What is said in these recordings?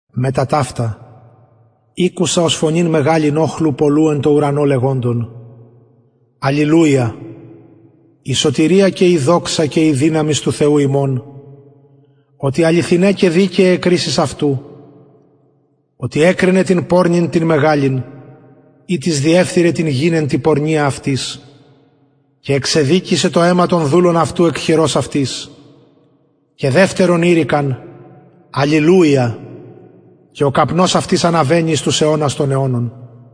μετα ταυτα ηκουσα ως φωνην μεγαλην οχλου πολλου εν τω ουρανω λεγοντων αλληλουια η σωτηρια και η δυναμις και η δοξα του θεου ημων οτι αληθιναι και δικαιαι αι κρισεις αυτου οτι εκρινεν την πορνην την μεγαλην ητις διεφθειρεν την γην εν τη πορνεια αυτης και εξεδικησεν το αιμα των δουλων αυτου εκ χειρος αυτης και δευτερον ειρηκεν αλληλουια και ο καπνος αυτης αναβαινει εις τους αιωνας των αιωνων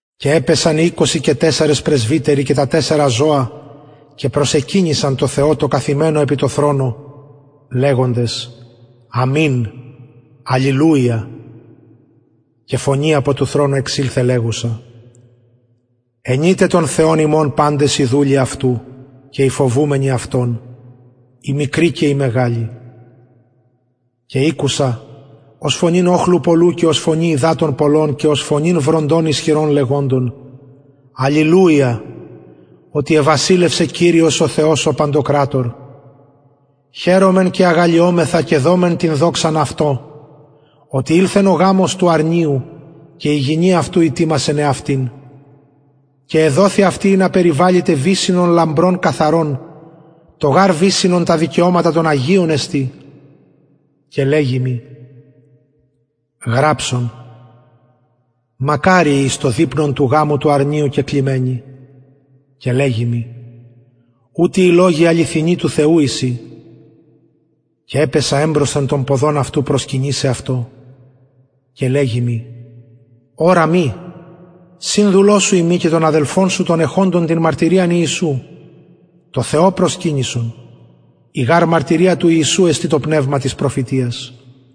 και επεσον οι πρεσβυτεροι οι εικοσι τεσσαρες και τα τεσσαρα ζωα και προσεκυνησαν τω θεω τω καθημενω επι του θρονου λεγοντες αμην αλληλουια και φωνη απο του θρονου εξηλθεν λεγουσα αινειτε τον θεον ημων παντες οι δουλοι αυτου και οι φοβουμενοι αυτον οι μικροι και οι μεγαλοι και ηκουσα ως φωνην οχλου πολλου και ως φωνην υδατων πολλων και ως φωνην βροντων ισχυρων λεγοντες αλληλουια οτι εβασιλευσεν κυριος ο θεος ημων ο παντοκρατωρ χαιρωμεν και αγαλλιωμεθα και δωμεν την δοξαν αυτω οτι ηλθεν ο γαμος του αρνιου και η γυνη αυτου ητοιμασεν εαυτην και εδοθη αυτη ινα περιβαληται βυσσινον λαμπρον και καθαρον το γαρ βυσσινον τα δικαιωματα των αγιων εστιν και λεγει μοι γραψον μακαριοι οι εις το δειπνον του γαμου του αρνιου κεκλημενοι και λεγει μοι ουτοι οι λογοι αληθινοι του θεου εισιν και επεσα εμπροσθεν των ποδων αυτου προσκυνησαι αυτω και λεγει μοι ορα μη συνδουλος σου ειμι και των αδελφων σου των εχοντων την μαρτυριαν ιησου τω θεω προσκυνησον η γαρ μαρτυρια του ιησου εστιν το πνευμα της προφητειας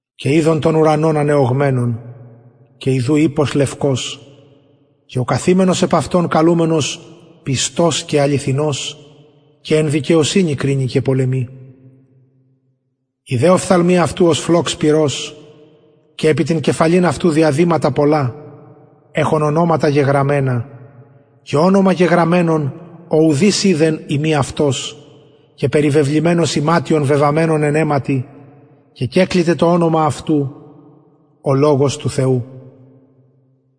και ειδον τον ουρανον ανεωγμενον και ιδου ιππος λευκος και ο καθημενος επ αυτον καλουμενος πιστος και αληθινος και εν δικαιοσυνη κρινει και πολεμει οι δε οφθαλμοι αυτου φλοξ πυρος και επι την κεφαλην αυτου διαδηματα πολλα εχων ονοματα γεγραμμενα και ονομα γεγραμμενον ο ουδεις οιδεν ει μη αυτος και περιβεβλημενος ιματιον βεβαμμενον αιματι και καλειται το ονομα αυτου ο λογος του θεου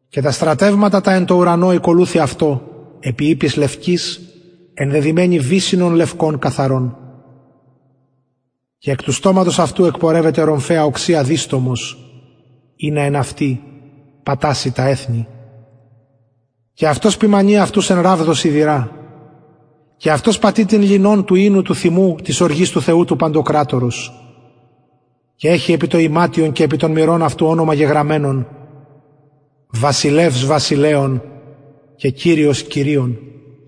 και τα στρατευματα τα εν τω ουρανω ηκολουθει αυτω επι ιπποις λευκοις ενδεδυμενοι βυσσινον λευκον καθαρον και εκ του στοματος αυτου εκπορευεται ρομφαια διστομος οξεια ινα εν αυτη παταξη τα εθνη και αυτος ποιμανει αυτους εν ραβδω σιδηρα και αυτος πατει την ληνον του οινου του θυμου της οργης του θεου του παντοκρατορος και εχει επι το ιματιον και επι τον μηρον αυτου ονομα γεγραμμενον βασιλευς βασιλεων και κυριος κυριων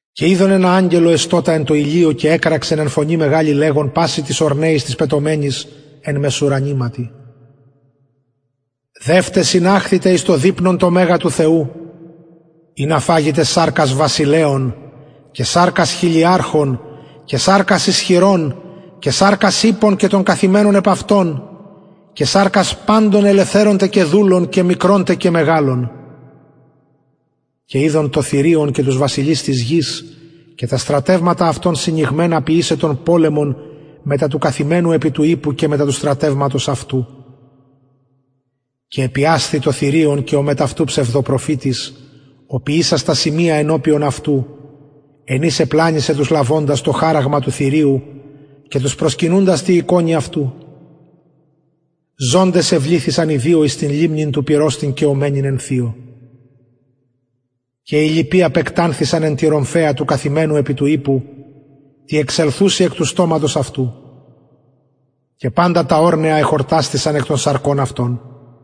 και ειδον αγγελον εστωτα εν τω ηλιω και εκραξεν φωνη μεγαλη λεγων πασιν τοις ορνεοις τοις πετομενοις εν μεσουρανηματι δευτε συναχθητε εις το δειπνον το μεγα του θεου ινα φαγητε σαρκας βασιλεων και σαρκας χιλιαρχων και σαρκας ισχυρων και σαρκας ιππων και των καθημενων επ αυτων και σαρκας παντων ελευθερων τε και δουλων και μικρων τε και μεγαλων και ειδον το θηριον και τους βασιλεις της γης και τα στρατευματα αυτων συνηγμενα ποιησαι πολεμον μετα του καθημενου επι του ιππου και μετα του στρατευματος αυτου και επιασθη το θηριον και ο μετ αυτου ψευδοπροφητης ο ποιησας τα σημεια ενωπιον αυτου εν οις επλανησεν τους λαβοντας το χαραγμα του θηριου και τους προσκυνουντας τη εικονι αυτου ζωντες εβληθησαν οι δυο εις την λιμνην του πυρος την καιομενην εν θειω και οι λοιποι απεκτανθησαν εν τη ρομφαια του καθημενου επι του ιππου τη εξελθουση εκ του στοματος αυτου και παντα τα ορνεα εχορτασθησαν εκ των σαρκων αυτων